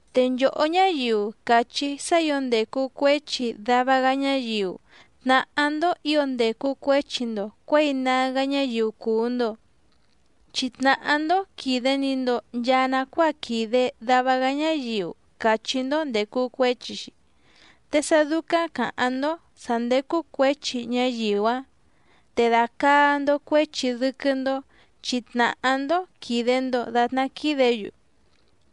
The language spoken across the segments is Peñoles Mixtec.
Te nchòhó ñáyiu càchí sá ǐo ndècu cuéchi dava‑gá ñáyiu tnàhá‑ndó ǐo ndècu cuéchi‑ndo cuěi nágá ñáyiu cùu‑ndo, chi tnàhá‑ndó quìde‑ni‑ndo nchaa nacuáa quìde dava‑gá ñáyiu càchí‑ndó ndècu cuéchi‑xi, te sá dúcáⁿ càháⁿ‑ndó sǎ ndécú cuěchi ñáyiu‑áⁿ te dàcaa‑ndo cuéchi dɨ́quɨ́‑ndó chi tnàhá‑ndó quìde‑ndo datná quídě‑yu.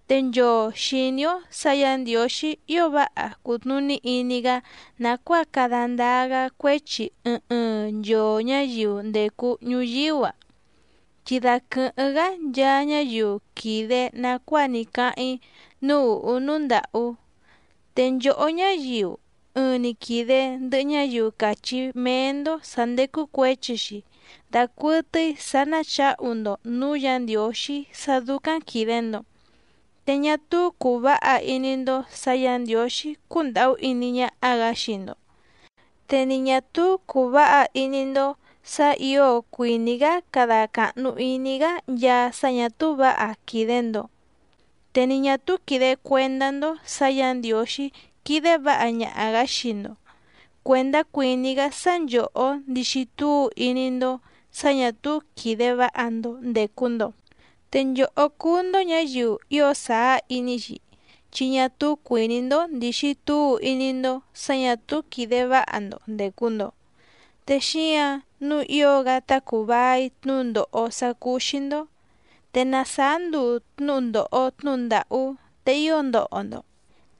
Te nchoo xìní‑ó sǎ Yǎ Ndiǒxí ío váha cùtnuní iní‑gá nàcuáa cada ndáá‑gá cuéchi ɨɨⁿ ɨɨⁿ nchoo ñǎyiu ndècu ñuyíú‑a, chi daquɨ̀hɨ́ⁿ‑gá nchaa ñáyiu quìde nacuáa ní cáháⁿ‑í núú ùhú núú ndàhú. Te nchòhó ñáyiu ɨɨⁿ‑ni quìde ndɨhɨ ñáyiu càchí méé‑ndó sǎ ndécú cuěchi‑xi dacuɨtɨ́í sǎ ná chǎhu‑ndo nǔú Yǎ Ndiǒxí sá dúcáⁿ quìde‑ndo. Te ñá túú cùu váha iní‑ndó sǎ Yǎ Ndiǒxí cúndàhú iní ñáhá‑gǎ xii‑ndo, te ni ñà túú cùu váha iní‑ndó sǎ ǐo cuìní‑gá cada càhnu iní‑gá nchaa sá ñà túú vǎha quìde‑ndo, te ni ñà túú quìde cuendá‑ndó sǎ Yǎ Ndiǒxí quídé vǎha ñaha‑gǎ xii‑ndo cuèndá cuìní‑gá sá nchòhó ndixi túu iní‑ndó sǎ ñà túú quìde váha‑ndo ndècu‑ndo. Te nchòhó cúú‑ndó ñǎyiu ío sàá iní‑xi, chi ñá túú cuìní‑ndó ndìxi túu iní‑ndó sǎ ñà túú quìde váha‑ndo ndècu‑ndo, te xíǎⁿ nǔu ío‑gá tá cùu vai tnúndòho sá cúú‑xí‑ndó. Te na sàá nduu tnúhu ndòho tnúhu ndàhú te ío ndoho‑ndo,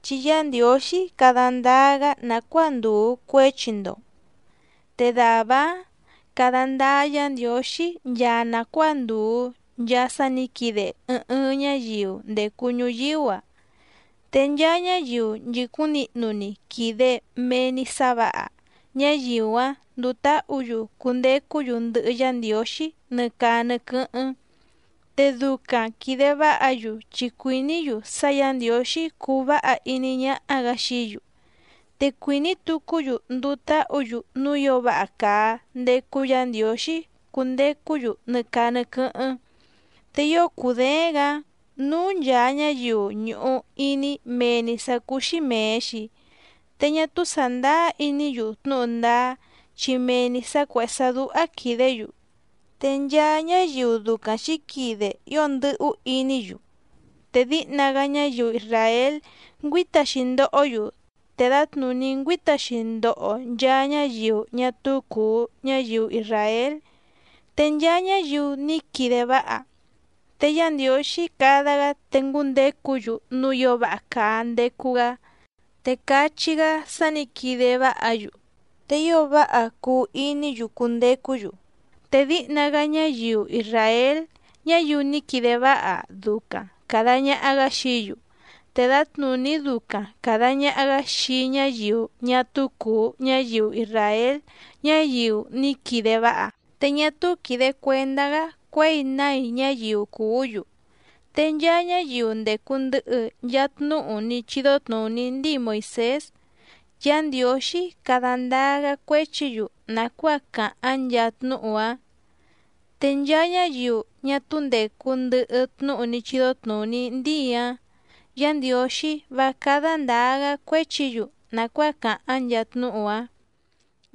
chi Yá Ndiǒxí cada ndáá‑gá nàcuáa ndùu cuéchi‑ndo. Te dàvá‑áⁿ cada ndáá Yǎ Ndiǒxí nchaa nàcuáa ndùu nchaa sá nǐ quide ɨɨⁿ ɨɨⁿ ñáyiu ndècu ñuyíú‑a. Te nchaa ñáyiu nchìcúⁿ nihnu‑ni quìde mee‑ni sá vǎha, ñáyiu‑áⁿ nduu táhǔ‑yu cundecú‑yu ndɨhɨ Yá Ndiǒxí nɨ caa nɨ quɨ́hɨ́ⁿ, te ducaⁿ quìde váha‑yu chi cuìní‑yu sá Yǎ Ndiǒxí cuu váha iní ñáhá‑gǎ xií‑yu, te cuìní tucú‑yu nduu táhǔ‑yu núú ǐo váha càa ndecu Yá Ndiǒxí cundecú‑yu nɨ caa nɨ quɨ́hɨ́ⁿ. Te ío cùdééⁿ‑gǎ núú nchàa ñáyiu ñùhu iní mee‑ni sǎ cúú‑xí mèe‑xi, te ñá túú sàndáá iní‑yu tnúhu ndáá chi mee‑ni sǎ cuèhé sá dúhá quìdé‑yu. Te nchaa ñáyiu ducaⁿ xǐquide ío ndɨ́hú iní‑yu. Te díhna‑gá ñáyiu isràél ngüíta‑xi ndohó‑yu, te dǎtnùní ngüíta‑xi ndoho nchaa ñáyiu ñá túú cùu ñáyiu isràél. Te nchaa ñáyiu ní quide váha, te Yá Ndiǒxí cada‑gá te ngúndecú‑yu núú ǐo váha càa ndecu‑gá, te cachí‑gá sá nǐ quide váha‑yu, te ío váha cuu iní‑yu cundecú‑yu. Te díhna‑gá ñáyiu isràél ñáyiu ní quide váha ducaⁿ càda ñaha‑gá xií‑yu, te dǎtnùní ducaⁿ càda ñaha‑gá xii ñáyiu ñá túú cùu ñáyiu isràél ñáyiu ní quide váha. Te ñá túú quìde cuendá‑gá cuěi nái ñáyiu cùú‑yu. Te nchaa ñáyiu ndècu ndɨhɨ nchaa tnúhu ní chídó tnùní ndíi Moìsés, Yá Ndiǒxí cada ndáá‑gá cuéchi‑yu nàcuáa càháⁿ nchaa tnúhu‑áⁿ. Te nchaa ñáyiu ñá túú ndècu ndɨhɨ tnúhu ní chídó tnùní ndíi‑áⁿ, Yá Ndiǒxí vá cádá ndǎá‑gá cuéchi‑yu nàcuáa càháⁿ nchaa tnúhu‑áⁿ.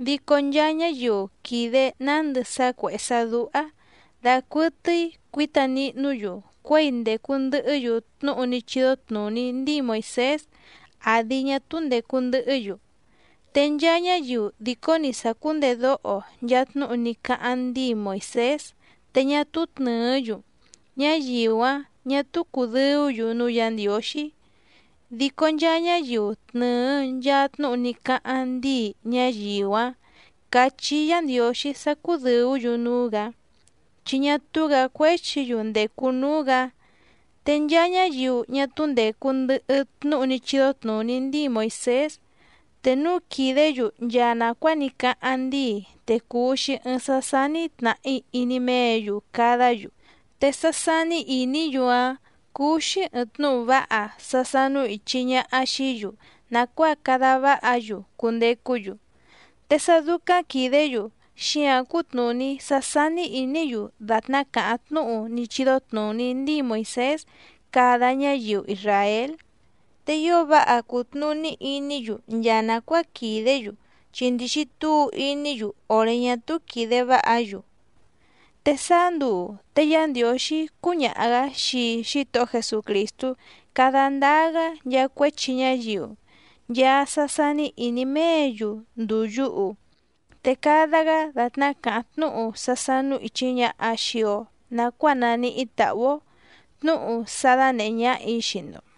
Dico nchaa ñáyiu quìde nándɨ sá cuèhé sá dúhá dàcuɨtɨ́í cuǐta nihnú‑yu cuěi ndècu ndɨhɨ́‑yu tnúhu ní chídó tnùní ndíi Moìsés àdi ñá túú ndècu ndɨhɨ́‑yu. Te nchaa ñáyiu dìcó‑ni sàcúndedóho nchaa tnúhu ní cáháⁿ ndíi Moìsés te ñá túú tnɨ̀ɨ́‑yu, ñáyiu‑áⁿ ñà túú cùdɨú‑yu núú Yǎ Ndiǒxí, dico nchaa ñáyiu tnɨ̀ɨ nchaa tnúhu ní cáháⁿ ndíi, ñáyiu‑áⁿ càchí Yǎ Ndiǒxí sá cúdɨ̀ú‑yu núú‑gǎ, chi ñá túú‑gǎ cuéchi‑yu ndècu núú‑gǎ. Te nchaa ñáyiu ñá túú ndècu ndɨhɨ tnúhu ní chídó tnùní ndíi Moìsés, te núu quìdé‑yu nchaa nàcuáa ní cáháⁿ ndíi te cùu‑xi ɨɨⁿ sá sání tnàhí iní méě‑yu cadá‑yu, te sá sání ìní‑yu‑áⁿ cúú‑xí ɨ̀ɨⁿ tnúhu váha sá sánú ìchi ñaha xií‑yu nàcuáa cada váha‑yu cundecú‑yu. Te sá dúcáⁿ quìdé‑yu xíǎⁿ cútnùní sá sání ìní‑yu dàtná càháⁿ tnúhu ní chídó tnùní ndíi Moìsés cada ñáyiu isràél, te ío váha cùtnuní iní‑yu nchaa nàcuáa quìdé‑yu chi ndìxi túu iní‑yu òré ñá túú quìde váha‑yu. Te sáá nduu te Yá Ndiǒxí cúñaha‑gǎ xii Xítohó Jesucrìstú cada ndáá‑gá nchaa cuéchi ñáyiu, nchaa sá sání ìní méě‑yu ndùu yuhu, te cada‑gá dàtná càháⁿ tnúhu sá sánú ìchi ñaha xii‑o nacuáa naníhí tàhú‑ó, tnúhu sá dánèhé ñáhà‑í xii‑ndo.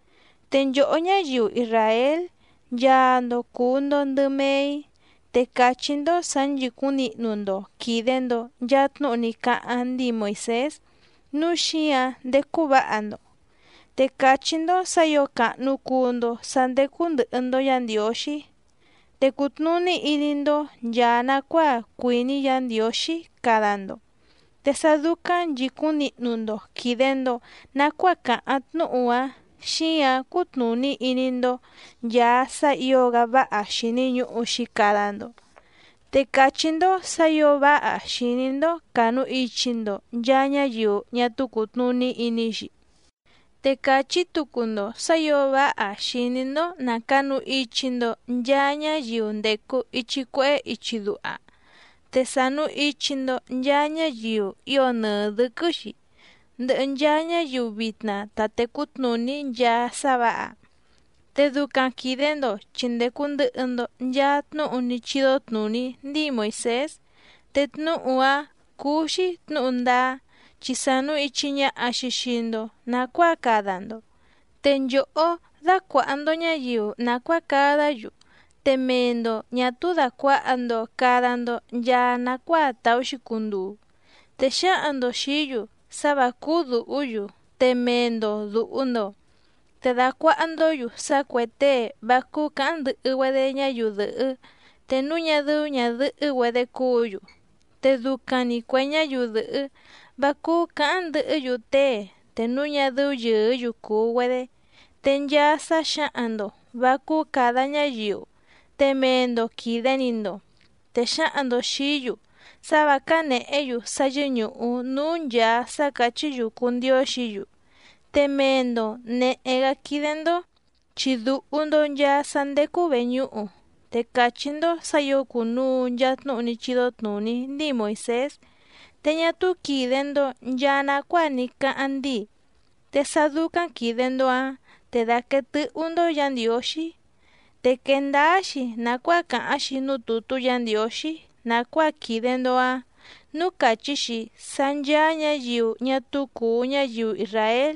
Te nchòhó ñáyiu isràél nchaa‑ndo cùu‑ndo ndɨ mee‑í, te càchí‑ndó sǎ nchìcúⁿ nihnu‑ndo quìde‑ndo nchaa tnúhu ní cáháⁿ ndíi Moìsés nǔu xíǎⁿ ndécú vǎha‑ndo, te càchí‑ndó sǎ ǐo càhnu cuu‑ndo sá ndécú ndɨ̀hɨ‑ndo Yá Ndiǒxí. Te cùtnuní iní‑ndó nchàa nacuáa cuìní Yǎ Ndiǒxí cada‑ndo, te sá dúcáⁿ nchìcúⁿ nihnu‑ndo quìde‑ndo nacuáa càháⁿ tnúhu‑áⁿ xǐǎⁿ cútnùní iní‑ndó nchàa sá ǐo‑gá váha xìni ñuhu‑xi cada‑ndo. Te càchí‑ndó sǎ ǐo váha xìní‑ndó cànuichi‑ndo nchaa ñáyiu ñá túú cùtnuní iní‑xi, te càchí tucu‑ndo sǎ ǐo váha xìní‑ndó nà canu ichi‑ndo nchaa ñáyiu ndècu ichi cuehé ichi duha. Te sànu ichi‑ndo nchaa ñáyiu ío nɨɨ dɨ̌quɨ́‑xi, ndɨhɨ nchaa ñáyiu vitna ta tècú tnùní nchaa sá vǎha, te ducaⁿ quìde‑ndo chi ndècu ndɨhɨ‑ndo nchaa tnúhu ní chídó tnùní ndíi Moìsés, te tnúhu‑áⁿ cúú‑xí tnǔhu ndáá, chi sànu ichi ñaha‑xi xii‑ndo nacuáa cada‑ndo. Te nchòhó dàcuaha‑ndo ñáyiu nàcuáa cadá‑yu, te mee‑ndo ñà túú dàcuaha‑ndo cada‑ndo nchaa nacuáa tàú‑xi cunduu, te xǎhaⁿ‑ndo xìí‑yu sá vǎ cúú dùhú‑yu te mee‑ndo dùhu‑ndo. Te dàcuaha‑ndó‑yu sá cuè tée vá cúú cǎháⁿ ndɨhɨ‑güedé ñáyiu dɨ̀hɨ́ te núu ñá dɨ́ú ñàdɨhɨ́‑güedé cúǔ‑yu, te ducaⁿ‑ni cuè ñáyiu dɨ̀hɨ́, vá cúú cǎháⁿ ndɨhɨ́‑yu tée te núu ñá dɨ́ú yɨ̀ɨ́‑yu cùu‑güedé. Te nchaa sá xǎhaⁿ‑ndo vǎ cúú càda ñáyiu te mee‑ndo quìde‑ni‑ndo, te xǎhaⁿ‑ndo xìí‑yu sá vǎ cánèhé‑yu sá yɨ́ñùhu núú nchàa sá càchí‑yu cùu ndióxǐ‑yu, te mee‑ndo nèhé‑gá quídé‑ndó, chi dùhu‑ndo nchaa sá ndécú vèñúhu. Te càchí‑ndó sǎ ǐo cùnuu nchaa tnúhu ní chídó tnùní ndíi Moìsés, te ñá túú quìde‑ndo nchaa nacuáa ní cáháⁿ ndíi, te sá dúcáⁿ quìde‑ndo‑áⁿ te dàquee tɨ́hú‑ndó Yǎ Ndiǒxí. Te quèe ndáá‑xi nàcuáa càháⁿ‑xi núú tùtú Yǎ Ndiǒxí nàcuáa quìde‑ndo‑áⁿ nǔú càchí‑xi sá ncháá ñǎyiu ñá túú cùu ñáyiu isràél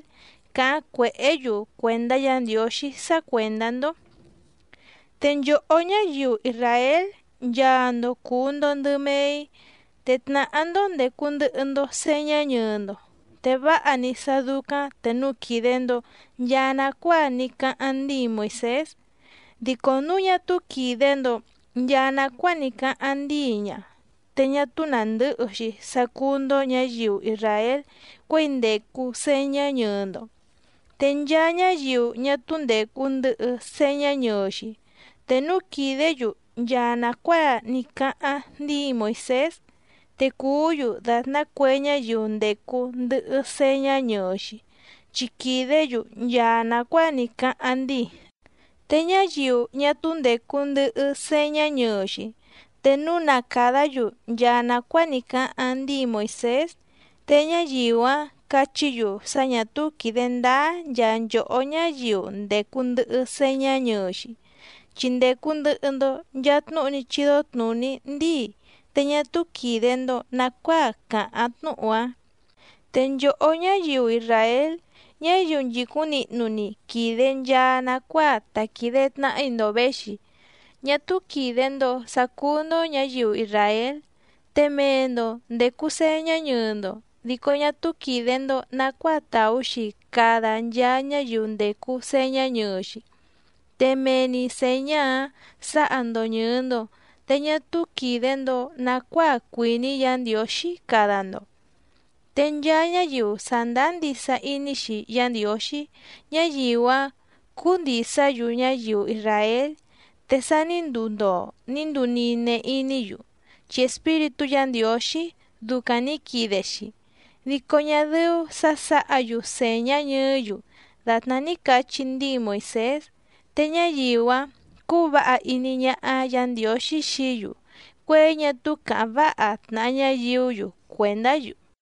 càháⁿ cuèhé‑yu cuèndá Yǎ Ndiǒxí sá cuèndá‑ndó. Te nchòhó ñáyiu isràél nchaa‑ndo cùu‑ndo ndɨ mee‑í, te tnàhá‑ndó ndècu ndɨhɨ‑ndo señá ñɨɨ‑ndo, te váha‑ni sá dúcáⁿ te núu quìde‑ndo nchaa nacuáa ní cáháⁿ ndíi Moìsés. Dico núu ñá túú quìde‑ndo nchaa nacuáa ní cáháⁿ ndíi ña, te ñá túú nàndɨ́hɨ‑xi sá cúú‑ndó ñǎyiu isràél cuěi ndècu señá ñɨɨ‑ndo. Te nchaa ñáyiu ñá túú ndècu ndɨhɨ señá ñɨɨ‑xi, te núu quìdé‑yu nchaa nàcuáa ní cáháⁿ ndíi Moìsés, te cùú‑yu dàtná cue ñáyiu ndècu ndɨhɨ señá ñɨɨ‑xi, chi quìdé‑yu nchaa nàcuáa ní cáháⁿ ndíi. Te ñáyiu ñá túú ndècu ndɨhɨ señá ñɨɨ‑xi, te núu na càdá‑yu nchaa nàcuáa ní cáháⁿ ndíi Moìsés, te ñáyiu‑áⁿ cachí‑yu sá ñà túú quìde ndáá nchaa nchòhó ñáyiu ndècu ndɨhɨ señá ñɨɨ‑xi, chi ndècu ndɨhɨ‑ndo nchaa tnúhu ní chídó tnùní ndíi te ñá túú quìde‑ndo nacuáa càháⁿ tnúhu‑áⁿ. Te nchòhó ñáyiu isràél, ñáyiu nchìcúⁿ nihnu‑ni quìde nchaa nacuáa ta quìde tnahi‑ndo véxi, ñá túú quìde‑ndo sá cúú‑ndó ñǎyiu isràél, te mee‑ndo ndècu señá ñɨɨ‑ndo dico ñá túú quìde‑ndo nacuáa tàú‑xi cada nchaa ñáyiu ndècu señá ñɨɨ‑xi, te mee‑ni sèñá‑áⁿ sǎha‑ndo ñɨ̀ɨ‑ndo te ñá túú quìde‑ndo nacuáa cuìní Yǎ Ndiǒxí cada‑ndo. Te nchaa ñáyiu sàndáá ndisa iní‑xi Yá Ndiǒxí, ñáyiu‑áⁿ cúú ndìsá‑yu ñáyiu isràél, te sa ní nduu ndoo ní nduu nine iní‑yu chi Espíritú Yǎ Ndiǒxí ducaⁿ nǐ quide‑xi, dico ñá dɨ́ú sǎ sǎha‑yu sèñá ñɨɨ́‑yu dàtná ní cachí ndíi Moìsés. Te ñáyiu‑áⁿ cúú vǎha iní ñáhá Yǎ Ndiǒxí xií‑yu cuěi ñá túú càháⁿ váha tnàha ñáyiú‑yu cuèndá‑yu.